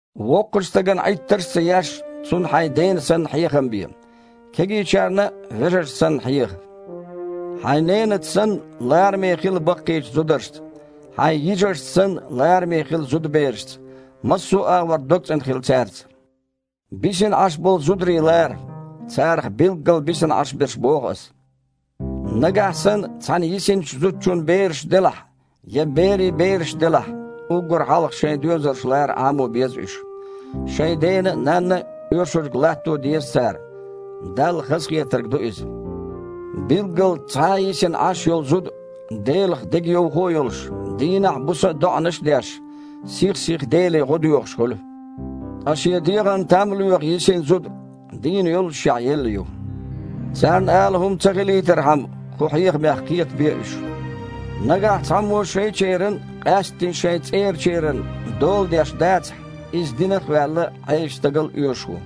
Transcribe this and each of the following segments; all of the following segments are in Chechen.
Воккхачу стагана Іиттарш а ца еш, цунна хьайн дена санна хьехам бе, кегийчарна а, вежаршна санна, хьеха. Хьайн ненаца санна, лараме хила баккхийчу зударшца, хьайн йижаршца санна, лараме хила зудаберашца. Массо а агІор догцІена хила цаьрца. Бисина Іаш болу зударий лара – царах билггал бисина Іаш берш боху ас. Нагахь санна цхьана йисинчу зудчун бераш делахь, я берийн бераш делахь, уггар хьалха шайн доьзалш лара Іамо беза уьш. Шайн дена а, нанна а оьшург латто а деза цара. Далла хазахетарг ду иза. Билггал цхьа йисина Іаш йолу зуда, Делах дегайовхо а йолуш, дийнахь а, буса а доІанаш а деш, сих-сиха Деле гІо доьхуш хуьлу. Ткъа шен дегІана там лоьху йисина зуда, дийна йоллушехь, елла ю. Царна ала хІума ца хилийтархьама, кху хьехамех кхетабе уьш. Нагахь цхьаммо шайчеран, къаьсттина шайн цІерачеран, дола деш дацахь, иза динах а ваьлла, Іесачу стагал а оьшуш ву.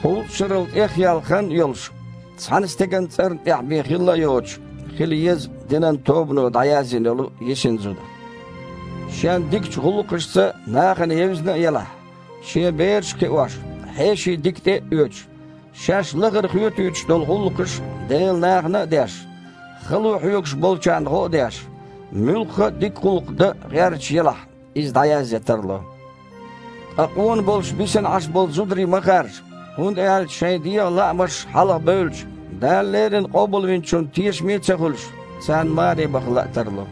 Кхузткъа шарал тІехъяьлла хан а йолуш, цхьана стеган цІарна тІехь бен хилла а йоцуш, хила еза динан тобано дІаязйина йолу йисина зуда. Шен дикачу гІуллакхашца нахана евзина а елахь, шен бераш а кхиош, хьеший дика тІе а оьцуш, шаьш лахара хоьтуьйтуш долу гІуллакхаш Делан нахана а деш, хало хьоьгуш болчарна гІо а деш, муьлхха а дика гІуллакх дан а гІерташ елахь, иза дІаязъян тарло. Ткъа къона болуш бисина Іаш болу зударий ма харжа, хІунда аьлча шайн дегІан лаамаш хьалха бевлча, Дала леррина Къобалвинчунна тешаме а ца хуьлуш, царна маре баха лаа тарло.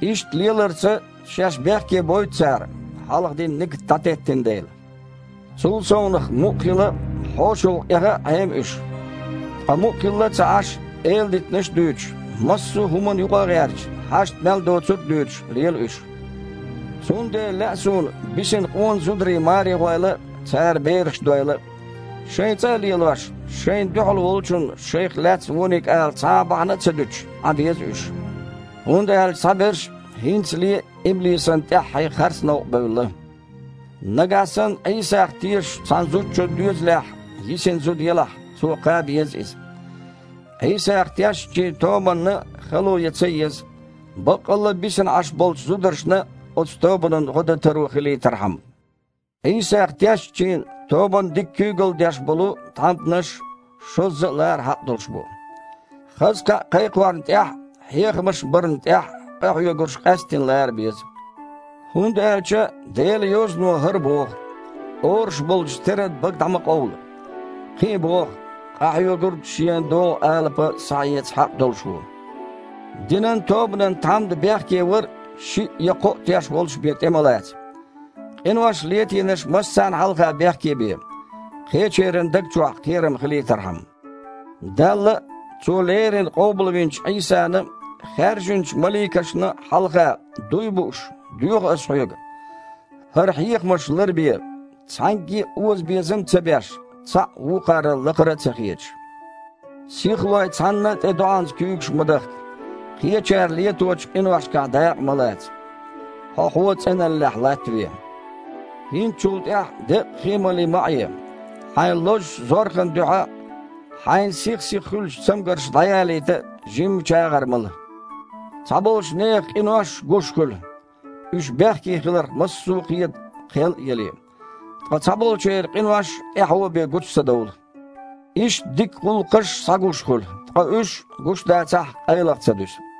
Иштта леларца шаьш бехкебойту цара, хьалха дина нигат дІатеттина дела. Цул совнаха, мукъа хила а, хьошалгІа эха а Іема уьш. Ткъа мукъа хилла а ца Іаш, эладитанаш а дуьйцуш, массо а хІуманна юкъа а гІерташ, хьашт мел доцург а дуьйцуш, лела уьш. Цундела лаьа суна бисина къона зударий маре гІойла а, цара бераш дойла а. Шайн цІа а лелош, шайна дуьхьал волчунна шайх лаьцна вониг ала цхьа а бахьана ца дуьтуш, Іан беза уьш. ХІунда аьлча цхьаберш хІинцале а иблисана тІаьххье харц новкъа бевлла. Нагахь санна Іийсах тешачу цхьана зудчун доьзалехь йисина зуда елахь, цо кхаба еза иза. Іийсах тешначийн тобанна хало ян ца еза, баккъалла а бисина Іаш болчу зударшна оцу тобанан гІо дан таро хилийтархьама. Іийсах тешначийн тобанна дика куьйгалла деш болу тхьамданаш шозза а лара хьакъ долуш бу. Хаза кхаъ кхайкхорна тІехь а, хьехамаш барна тІехь а къахьоьгурш къаьсттина лара беза. ХІунда аьлча Делан Йозано хІара боху: «Оруш болчу стеран бага дІа ма къовла». Кхин а боху: «Къахьоьгург шена догІу алапа схьаэца хьакъ долуш ву». Динан тобанан тхьамда бехкевар шиъ я кхоъ теш волуш бен тІе ма лаца. Къинош летийнарш массарна хьалха бехке бе, кхечеран а даг чохь кхерам хилийтархьама. Далла а, Цо леррина къобалвинчу Іийсана а, хаьржинчу маликашна а хьалха, дуй а бууш, доьху ас хьоьга: хІара хьехамаш ларбе, цхьаьнгге озабезам а ца беш, цхьаъ вукхарал лакхара а ца хеташ. Сихлой, цхьанна а тІе доІанца куьйгаш ма дахка. Кхечара леточу къиношкахь дакъа ма лаца. Хьо-хьо цІеналлехь латтаве. ХІинца чул тІаьхьа, деккъа хи а малий, ма Іе. Хьайн лозучу зорхан дуьхьа а, хьайна сих-сиха хуьлу цамгарш дІаялийта а жимма чагІар мала. Цхьаболчу нехан къинош гуш хуьлу, уьш бехке хиларх массо а кхета кхел а яле. Ткъа цхьаболчеран къинош тІаьхьо бен гучу ца довлу. Иштта дика гІуллакхаш а схьагуш хуьлу, ткъа уьш, гуш дацахь а, къайлаха а ца дуьсу.